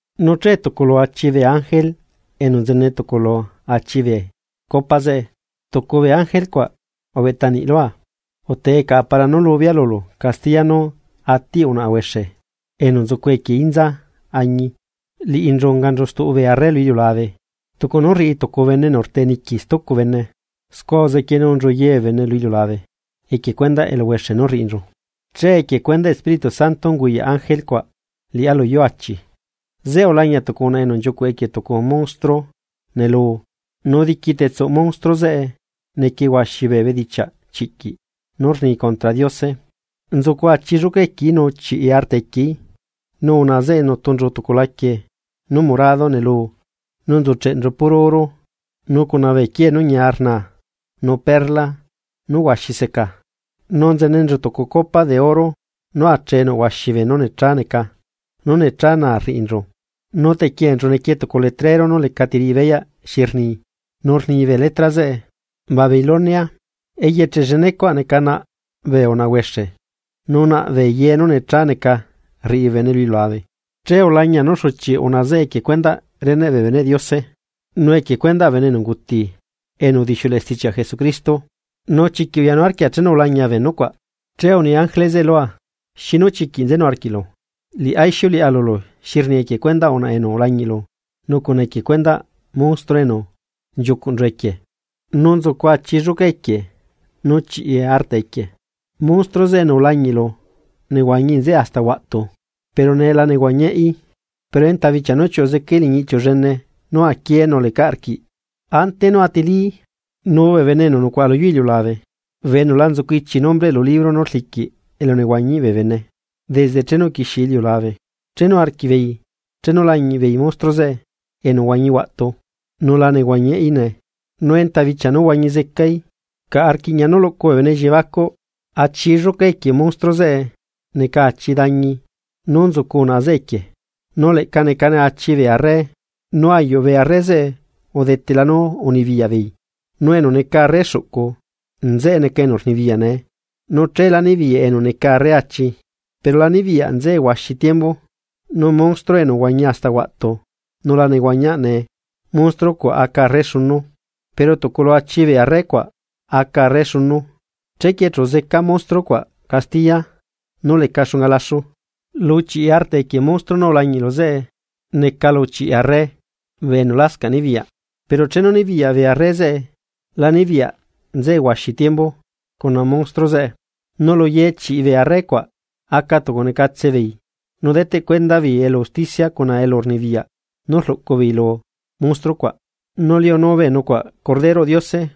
Nu che tucu lu achi bee ángele enu nzene tucu lu achi bee copa zeꞌe, tucu bee ángele cuaꞌ ubeꞌta niꞌlua: ―Utee caꞌa para nú lubea lulu castiya nú atiꞌ unaꞌa huexe enu nzucu equie inza añi. Liꞌinchu unganchu stuꞌu bee arre lu iliulabe, tucu nú rriꞌi tucu bene enu rteꞌniqui stucu bene, scua uzequienulanchu ye bee bene lu iliulabe equie cuendaꞌ eluhuexe nú rriꞌinchu. Che equie cuendaꞌ Espíritu Santo unguyaꞌ ángele cuaꞌ liꞌá lu yuu achi, zeꞌe ulañia tucu unaꞌa enu nchiucuꞌ equie tucu monstruo neluu nu diqui tetsuꞌ monstruo zeꞌe nequie huaxi bee bedichiaꞌ chiꞌquiꞌ nú rni contra Diose, nzucu achi lluca equieí nu chiꞌi arta equieí. Nu unaꞌa zeꞌe nutunchu tucu laquie nú morado neluu, nu nzucheꞌnchu puro oro nu cuna bee quiee nú ñia rnaa nu perla nú huaxi seca, nu nzenenchu tucu copa de oro nú achee nuꞌhuaxi beenú necha neca nu necha naa rriꞌinchu. Nu tequienchu nequie tucu letrero nú lecati riꞌi beyaꞌ xi rni, nu rni bee letra zeꞌe: “Babilonia, eyeche llenecuaꞌ neca naꞌ bee unaꞌa huexe nu naꞌ ye beenú necha neca rriꞌi bee bene lu iliulabe.” Che ulañia nú xuchiꞌ unaꞌa zeꞌe equie cuendaꞌ reneꞌ bee beneꞌ Diose, nu equie cuendaꞌ bee bene enu unguti enu udixiuleꞌe stichiaꞌ Jesucristo. Nu chiquiꞌ uyanu arquia chenu ulañia bee nucuaꞌ. Che uni ángele zeꞌe lua: ―¿Xinu chiquiꞌ nzenu arquiꞌlu? Liꞌá ixiuleꞌa lulu xi rni equie cuendaꞌ unaꞌa enu ulañiꞌlu nu cuna equie cuendaꞌ monstruo enu nchiucuꞌnchu equie, nu nzucu achi lluca equie nu chiꞌi arta equieí. Monstruo zeꞌe enu ulañiꞌlu, nehuañi nzeꞌe hasta huaꞌtu, pero nee la nehuañiaꞌí, pero enta bichia nú chiuꞌu zecaí liñi iꞌchiu llene nú aquie nu lecaꞌ rquiꞌ, ante nú atilií. Nu bee bene enu nucuaꞌa lu yuu iliulabe, bee enu la nzucu ichi nombreꞌ lu libro nú rliquiꞌ elunehuañiꞌ bee bene desde chenu uquixie iliulabe, chenu arquiꞌ beei chenu lañiꞌ beei monstruo zeꞌe enu uhuañi huaꞌtu nula nehuañiaꞌí nee, nu enta bichia nú huañi zecaí. Caꞌa rquiꞌña nú luꞌcu bee bene elliebacuꞌ. Achi lluca equie monstruo zeꞌe neca achi dañi nú nzucu unaꞌa zeꞌe equie. Nu leꞌca necane achi bee arre. Nu ayuꞌ bee arre zeꞌe udetela nú unibiyaꞌ beei, nu enu neca arre xuꞌcu nzeꞌe neca enu rnibiyaꞌ nee. Nu cheelá nibiyaꞌ enu neca arre achi, pero la nibiyaꞌ nzeꞌe huaxi tiembu. Nu monstruo enu uhuañi hasta huaꞌtu nu la nehuañiaꞌ nee, monstruo cuaꞌ aca arre xunu, pero tucu lu achi bee arre cuaꞌ aca arre xunu, chequie chu zeca monstruo cuaꞌ castiya nú leca xunga laxu. ’Lu chiꞌi arta equie monstruo nú ulañiꞌlu zeꞌe neca lu chiꞌi arre bee enu lascaꞌ nibiyaꞌ. Pero chenu nibiyaꞌ bee arre zeꞌe, la nibiyaꞌ nzeꞌe huaxi tiembu cuna monstruo zeꞌe. Nu lu ye chiꞌi bee arre cuaꞌ aca tucunecatse beei nu deteꞌ cuenda beei elu usticia cuna elurnibiyaꞌ nú rluꞌcu beei lu monstruo cuaꞌ. Nu liunu bee nucuaꞌ Corderoꞌ Diose,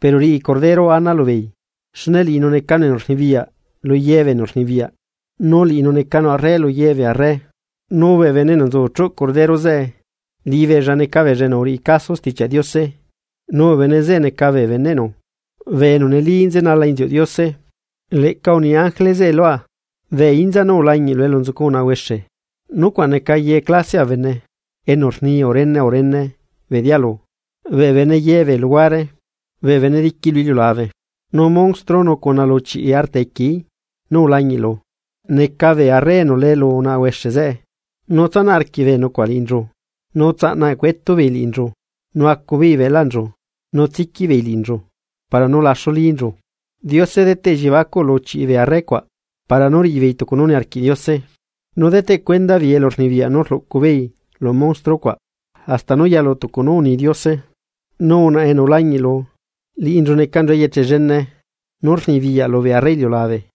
pero riꞌi Cordero ana lubeei, xne liꞌinu necanu enu rnibiyaꞌ lu ye bee enu rnibiyaꞌ nu liꞌinu necanu arre lu ye bee arre. Nu bee bene enu nzu chuꞌ Cordero zeꞌe, liꞌibeella neca beella enu uriꞌi caso Stichiaꞌ Diose. Nu bee bene zeꞌe neca bee beneꞌnu bee enu neli nzenala inziuꞌ Diose. Leꞌca uni ángele zeꞌe lua: ―Bee inza nú ulañiꞌlu elu nzucu unaꞌa huexe, nucuaꞌ neca ye clasiaꞌ bee bene, enu rni urene urene bee dialu, bee bene ye bee luhuare, bee bene diqui lu iliulabe. Nu monstruo nu cuna lu chiꞌi arta equieí nú ulañiꞌlu neca bee arre enu lee lu unaꞌa huexe zeꞌe, nu tsanaꞌ arquiꞌ bee nucuaꞌ liꞌinchu, nu tsaꞌna eꞌcuetubeei liꞌinchu, nu acubeei beꞌlaꞌnchu, nu tsiquiꞌbeei liꞌinchu para nú laxu linchu. Diose deteꞌ elliebacuꞌ lu chiꞌi bee arre cuaꞌ para nú riꞌibeei tucu nú niarquiꞌ Diose, nu deteꞌ cuenda beei elurnibiyaꞌ nú rluꞌcu beei lu monstruo cuaꞌ, hasta nú yalu tucu nú uni Diose. Nu unaꞌa enu ulañiꞌlu, liꞌinchu necanchu eyeche llene nú rnibiyaꞌ lubee arre iliulabe.